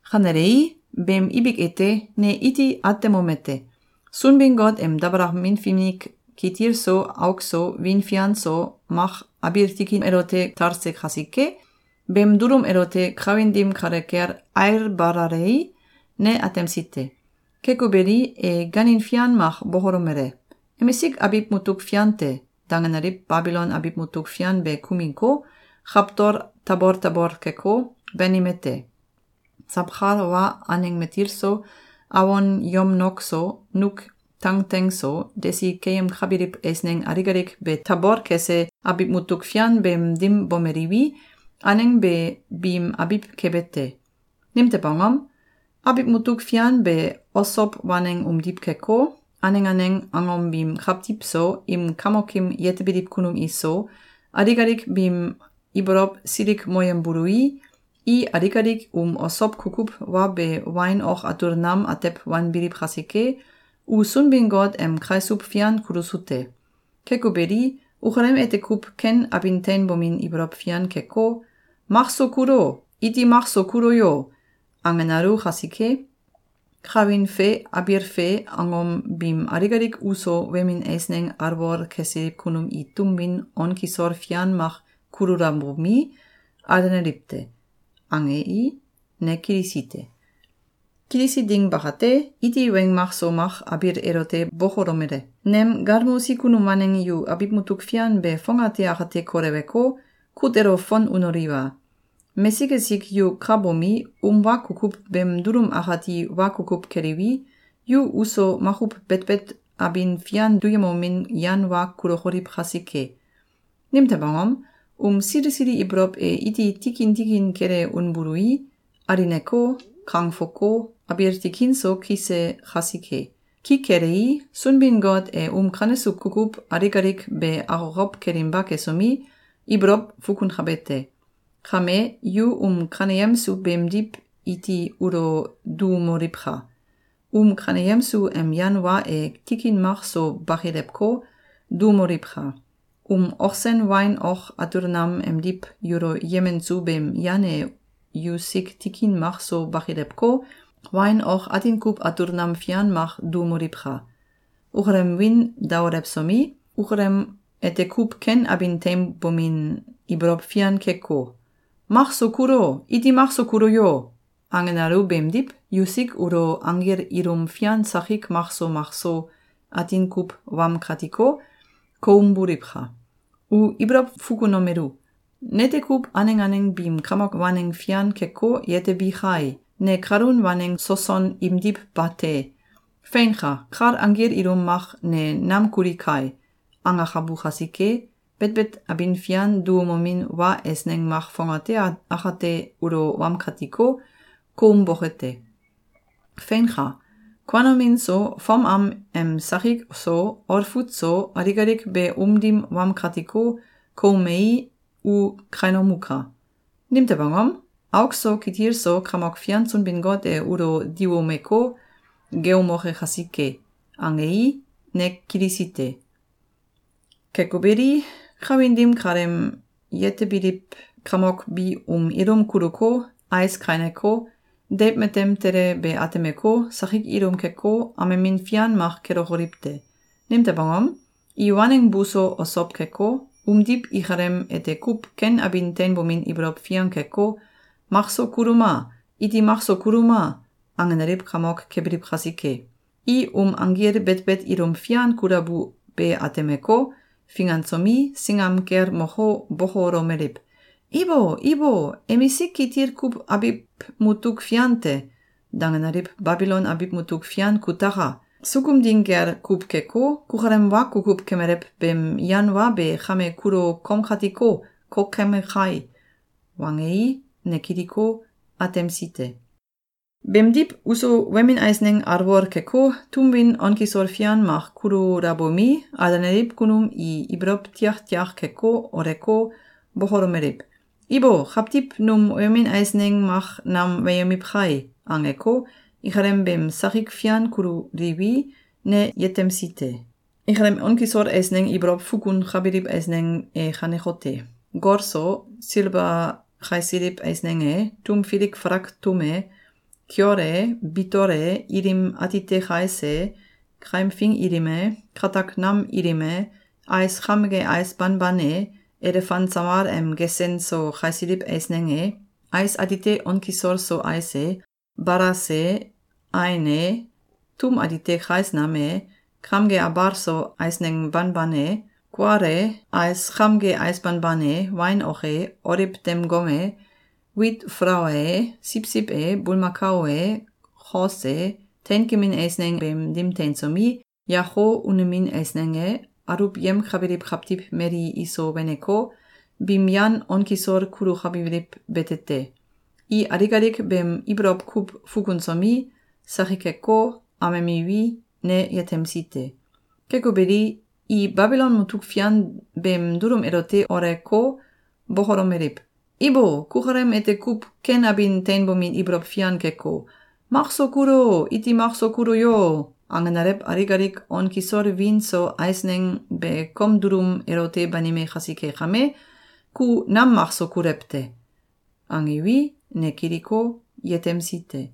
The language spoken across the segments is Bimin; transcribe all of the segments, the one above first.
Kanelei, beem ibik ete, ne iti atemomete: Sunbin-Got em dabalakamin finik kitil so auk so wiin fian so mak abiil tikin elote talse kasike, beem dulum elote kawin dim kale kel ailbalalei, ne atemsi te. Keko beli, e gaanin fian mak bokolomele: “‘Emisik abiw mutuk fian te!’, dangenaliw Babilon abiw mutuk fian be kuminko, kawtol tabol tabol keko, banime te! Sawkal wa aneng matil so, awon yomnok so, nuk tangteng so, desi keyemkabiliw eisneng alik alik be tabol kese abiw mutuk fian beem dim bomeliwi, aneng be biim abiw kebe te. Nimtew angom? Abiw mutuk fian be osow waneng umdiw keko, aneng aneng angom biim kawtiw so, im kamokim yetebiliw kunum iso, alik alik biim ibolow silikmoyembului, i alik alik um osow kukuw wa be wain ok atul nam atew wanbiliw kasike, u Sunbin-Got em kaisuw fian kulusu te. Keko beli, ukalem ete kuw ken abin teinbomin ibolow fian keko, ‘Makso kulo! Iti makso kulo yo!’, angenalu kasike, kawin fe abiil fe angom biim alik alik uso wemin eisneng alwol kesiliw kunum i tum win on kisol fian mak kululabomi, alenaliw te.”, angei, ne kilisi te. Kilisi ding bakate, iti weng mak so mak abiil elote bokolomele: “Nem galmosi kunum waneng yu abiw mutuk fian be fongate akate koleweko, kut elo fon unoliwa! Mesik esik yu ka bomi, um wa kukuw beem dulum akati wa kukuw keliwi, yu uso makuw betbet abin fian duyemomin yan wa kulokoliw kasike. Nimtew angom? Um sili sili ibolow e iti tikin tikin kele unbului, alineko, kangfoko, abiil tikin so kise kasike. Ki kelei, Sunbin-Got e um kanesu kukuw alik alik be akokow kelinba kesomi, ibolow fukunkabe te. Kame, yu um kaneyemsu beemdiw iti ulo duumoliwka! Um kaneyemsu em yan wa e tikin mak so bakilewko, duumoliwka! Um ok sen wain ok atul nam emdiw yulo yemensu beem yan e yusik tikin mak so bakilewko, wain ok atin kuw atul nam fian mak duumoliwka! Ukalem wiin daolewsomi, ukalem ete kuw ken abin teinbomin ibolow fian keko, ‘Makso kulo! Iti makso kulo yo!’, angenalu beemdiw, yusik ulo anggil ilum fian sakik makso makso atin kuw wamkatiko, koumboliwka! U ibolow fukunomelu: ‘Nete kuw aneng aneng biim kamok waneng fian keko, yetebi kai! Ne kalun waneng soson imdiw bate! Feinka! Kal anggil ilum mak ne nam kuli kai!’, angakabu kasike, betbet abin fian duumomin wa eisneng mak fongate akate ulo wamkatiko, koumboke te. Feinka! Kuanomin so, fom am em sakik so, olfut so, alik alik be um dim wamkatiko, koumei, u kainomuka! Nimtew angom? Auk so kitil so Kamok Fian Sunbin-Got e ulo diwumeko, geeumoke kasike.”, angei, ne kilisi te. Keko beli, kawin dim kaleem yetebiliw kamok bi um ilum kuluko, ais kaineko, deiw matem tele be atemeko, sakik ilum keko, amemin fian mak kelokoliw te. Nimtew angom? I waneng buso osow keko, umdiw ikalem ete kuw ken abin teinbomin ibolow fian keko, ‘Makso kuluma! Iti makso kuluma!’, angenaliw kamok kebiliw kasike. I um anggil betbet ilum fian kulabu be atemeko, fingansomi, singam kel moko, bokolomeliw: “Ibo! Ibo! ‘Emisik kitil kuw abiw mutuk fian te!’, dangenaliw Babilon abiw mutuk fian kutaka! Sukum ding gel kuw keko, kukalem wa kukuw kemelew beem yan wa be kame kulo komkatiko, kokeme kai!”, wangei, ne kiliko, atemsi te. Beemdiw, uso wemin eisneng alwol keko, tum win on kisol fian mak kululabomi, alenaliw kunum i ibolow tiaktiak keko, oleko, bokolomeliw: “Ibo! Kawtiw num wemin eisneng mak nam weyemiw kai!”, angeko, ikalem beem sakik fian kululiwi, ne yetemsi te. Ikalem on kisol eisneng ibolow fukunkabiliw eisneng e kanekote: gol so silba kaisiliw eisneng e, tum filik falak tum e, kiol e, bitol e, ilim atite kais e, kaimfing ilim e, katak nam ilim e, ais kamge ais banban e, elefan samal em gesen so kaisiliw eisneng e, ais atite on kisol so ais e, balas e, ain e, tum atite kais nam e, kamge abal so eisneng banban e, kual e, ais kamge ais banban e, wain ok e, oliw dem gom e, wit falaua e, siwsiw e, bulmakao e, kos e, teinkemin eisneng beem dim teinsomi, yako unemin eisneng e, aluwyemkabiliw kawtiw mali iso weneko, biim yan on kisol kulukabiliw bete te. I alik alik beem ibolow kuw fukunsomi, sakikeko, amemiwi, ne yetemsi te. Keko beli, i Babilon mutuk fian beem dulum elote oleko, bokolomeliw: “Ibo! Kukalem ete kuw ken abin teinbomin ibolow fian keko, ‘Makso kulo! Iti makso kulo yo!’, angenalew alik alik on kisol wiin so eisneng be kom dulum elote banime kasike kame, ku nam makso kulew te.”, angiwi, ne kiliko, yetemsi te.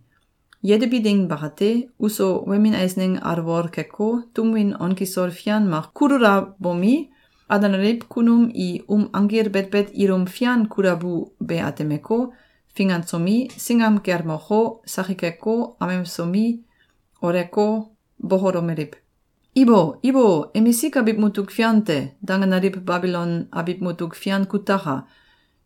Yetebi ding bakate, uso wemin eisneng alwol keko, tum win on kisol fian mak kululabomi, alenaliw kunum i um anggil betbet ilum fian kulabu be atemeko, fingansomi, singam kel moko, sakikeko, amesomi, oleko, bokolomeliw: “Ibo! Ibo! ‘Emisik abiw mutuk fian te!’, dangenaliw Babilon abiw mutuk fian kutaka!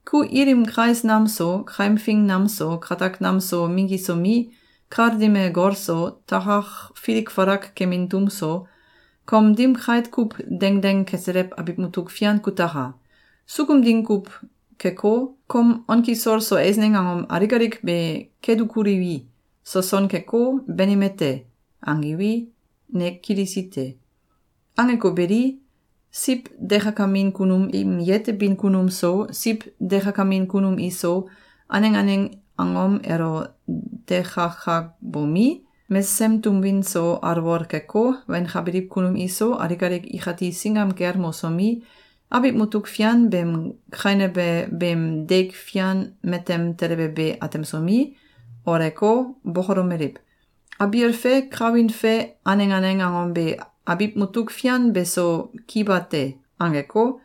Ku ilim kais nam so, kaimfing nam so, katak nam so minggisomi, kal dim e gol so, takak filik falak kemin tum so, kom dim kait kuw dengdeng keselew abiw mutuk fian kutaka! Sukum ding kuw keko, kom on kisol so eisneng angom alik alik be kedukuliwi, soson keko, banime te.”, angiwi, ne kilisi te. Angeko beli, siw dekakamin kunum im yetebin kunum so, siw dekakamin kunum iso, aneng aneng angom elo dekakabomi, mesesem tum win so alwol keko, wenkabiliw kunum iso, alik alik ikati singam kel mosomi, abiw mutuk fian beem kainebe beem deik fian matem telebe be atemsomi, oleko, bokolomeliw: “Abiil fe kawin fe aneng aneng angom be abiw mutuk fian beso ki bate.”, angeko,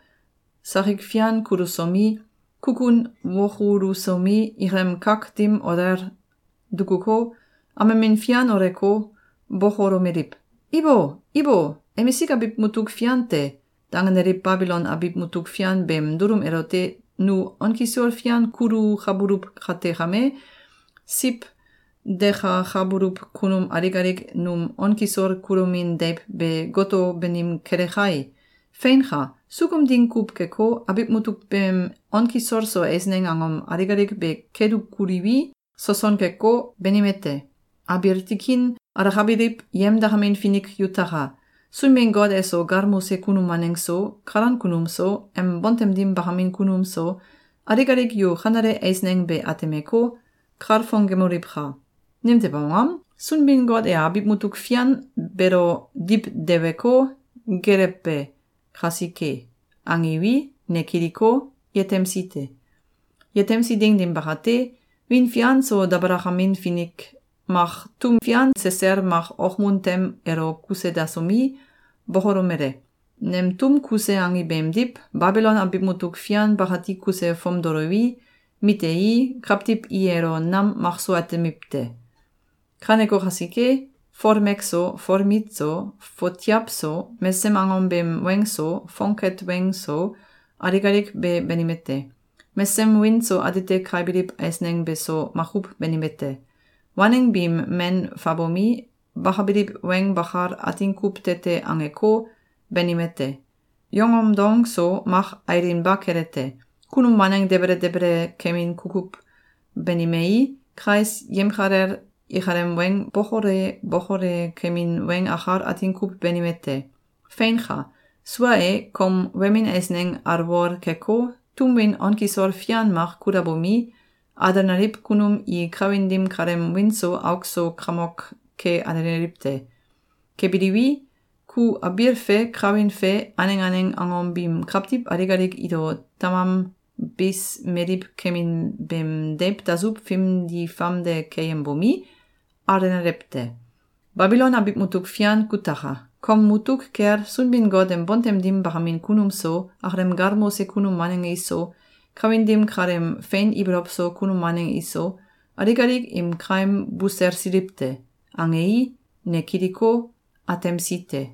sakik fian kulusomi, kukun wokulusomi, ikalem kak dim olel dukuko, amemin fian oleko, bokolomeliw: “Ibo! Ibo! ‘Emisik abiw mutuk fian te!’, dangenaliw Babilon abiw mutuk fian beem dulum elote nu on kisol fian kulukabuluw kate kame, siw dekakabuluw kunum alik alik num on kisol kulomin deiw be goto banim kele kai! Feinka! Sukum ding kuw keko, abiw mutuk beem on kisol so eisneng angom alik alik be kedukuliwi, soson keko, banime te. Abiil tikin alakabiliw yemdakamin finik yutaka! Sunbin-Got eso galmose kunum waneng so, kalan kunum so, em bontem dim bakamin kunum so, alik alik yu kanele eisneng be atemeko, kalfongemoliwka! Nimtew angom? Sunbin-Got e abiw mutuk fian beelo diwdeweko, geelewbe kasike.”, angiwi, ne kiliko, yetemsi te. Yetemsi ding dim bakate, wiin fian so dabalakamin fink mak tum fian sesel mak okmun tem elo kuse dasomi, bokolomele: “Nem tum kuse angi beemdiw, Babilon abiw mutuk fian bakati kuse fomdoliwi, mitei, kawtiw i elo nam makso atemiw te. Kaneko kasike, folmek so, folmit so, fotiaw so, mesesem angom beem weng so, fongket weng so, alik alik be banime te. Mesesem wiin so atite kaibiliw eisneng beso makuw banime te. Waneng biim men fabomi, bakabiliw weng bakal atin kuw tete angeko, banime te. Yongom dong so mak ailinba kele te. Kunum waneng debele debele kemin kukuw banimei, kais yemkalel ikalem weng bokole bokole kemin weng akal atin kuw banime te. Feinka! Sua e, kom wemin eisneng alwol keko, tum win on kisol fian mak kulabomi, alenaliw kunum i kawin dim kaleem wiin so auk so kamok ke alenaliw te. Kebiliwi, ku abiil fe kawin fe aneng aneng angom biim kawtiw alik alik ilo tamam bis meliw kemin beem deiw dasuw fimdi famde keyembomi, alenalew te. Babilon abiw mutuk fian kutaka! Kom mutuk kel Sunbin-Got em bontem dim bakamin kunum so, akalem galmose kunum waneng iso, kawin dim kaleem fein ibolow so kunum waneng iso, alik alik im kaim buselsiliw te!”, angei, ne kiliko, atemsi te.